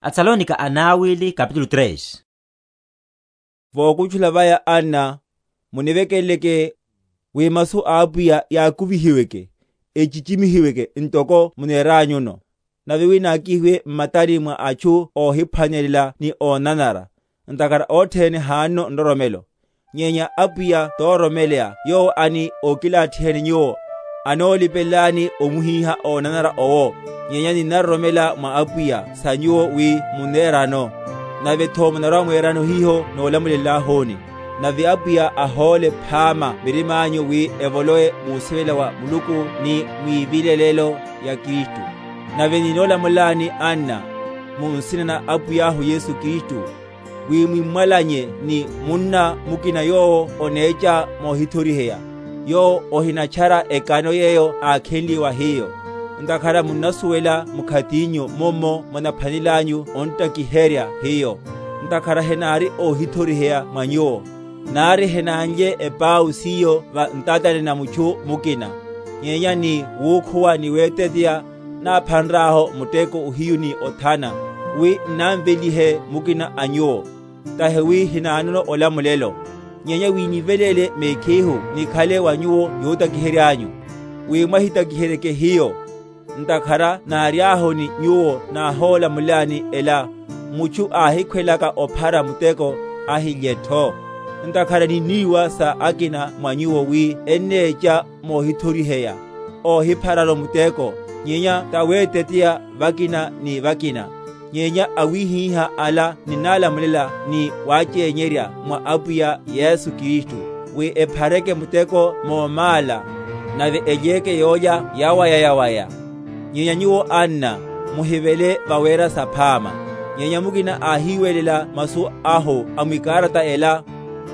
Sawalopolano ni olochela. Vokutchula vaya, anna, munivekeleleke, wi masu a Apwiya yakuveyeke, ochichimihiweke, ntoko muneranyuno; nave wi nákihiwe m’matani mwa atchu óhiphwanelela ni ónanara; ntakhara othene hanono nroromelo. Nyenya Apwiya tororomeleya yowo ani ókilathiheni nyuwo, anolipelelani omuhíha ónanara owo; nyenya ninnaroromela mwa Apwiya sa nyuwo, wi munnerano, navetho munarwa‐mwerano hiho n’nolamulelahuni. Nave Apwiya ahóle phama mirimányu wi evolowe musivela wa Muluku ni mwivilelelo ya Kristu. Nave ninnolamulelani, anna, mu nsina na Apwiyahu Yesu Kristu, wi mwímwalanye ni munna mukina yowo onecha mohithoriheya, yowo ohinatchara ekano yeyo ákhenliye wa hiyo. Ntakhara munnasuwela mkhatinyu mummo munaphwanelelanyu ontakiherya hiyo; ntakhara henári óhithoriheya mwa nyuwo; nari henánlye epau siyo va ntatani na mutchu mukina, nyenya ni wukhuwa ni weteteya, náphanrahu muteko ohiyu ni othana, wi n’námvelihe mukina a nyuwo; tahi wi hinanono olamulelo, nyenya wi níveléle mekhihu nikhale wa nyuwo yotakiheryányu, wi mwahintakiheryeke hiyo. Ntakhara náriahu ni nyuwo náholamulelani ela, Mutchu áhikhwelaka ophara muteko, ahilyetho. Ntakhara ninniwa sa akina mwa nyuwo wi ennecha mohithoriheya, óhiphararu muteko, nyenya taweteteya vakina ni vakina. Nyenya awihiha ala ninnálamulela ni wáchényerya mwa Apwiya Yesu Kristu, wi ephareke muteko mómála, nave elyeke yólya yawaya‐yawaya. Nyenya nyuwo, anna, muhivele vawera saphama. Nyenya mukina áhiwelela masu ahu mwikarata ela,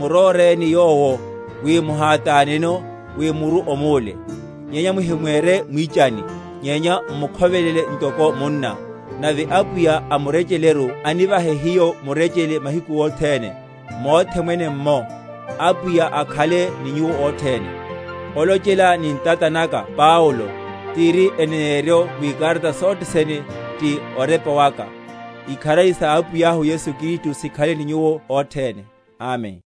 muróreni yowo, wi muhátáneno, wi muru omúle. Nyenya muhimwere mwichani, nyenya m’mukhovelele ntoko munna. Nave Apwiya a murecheleru anivahe hiyo murechele mahiku othene, mothe mwene’mmo. Apwiya akhale ni nyuwo othene. Olochela ni ntata naka Paulo; tiri eneneryo mwikarata sothe sene; ti orepa waka. Ikharari sa Apwiyahu Yesu Kristu sikhale ni nyuwo othene. Amen.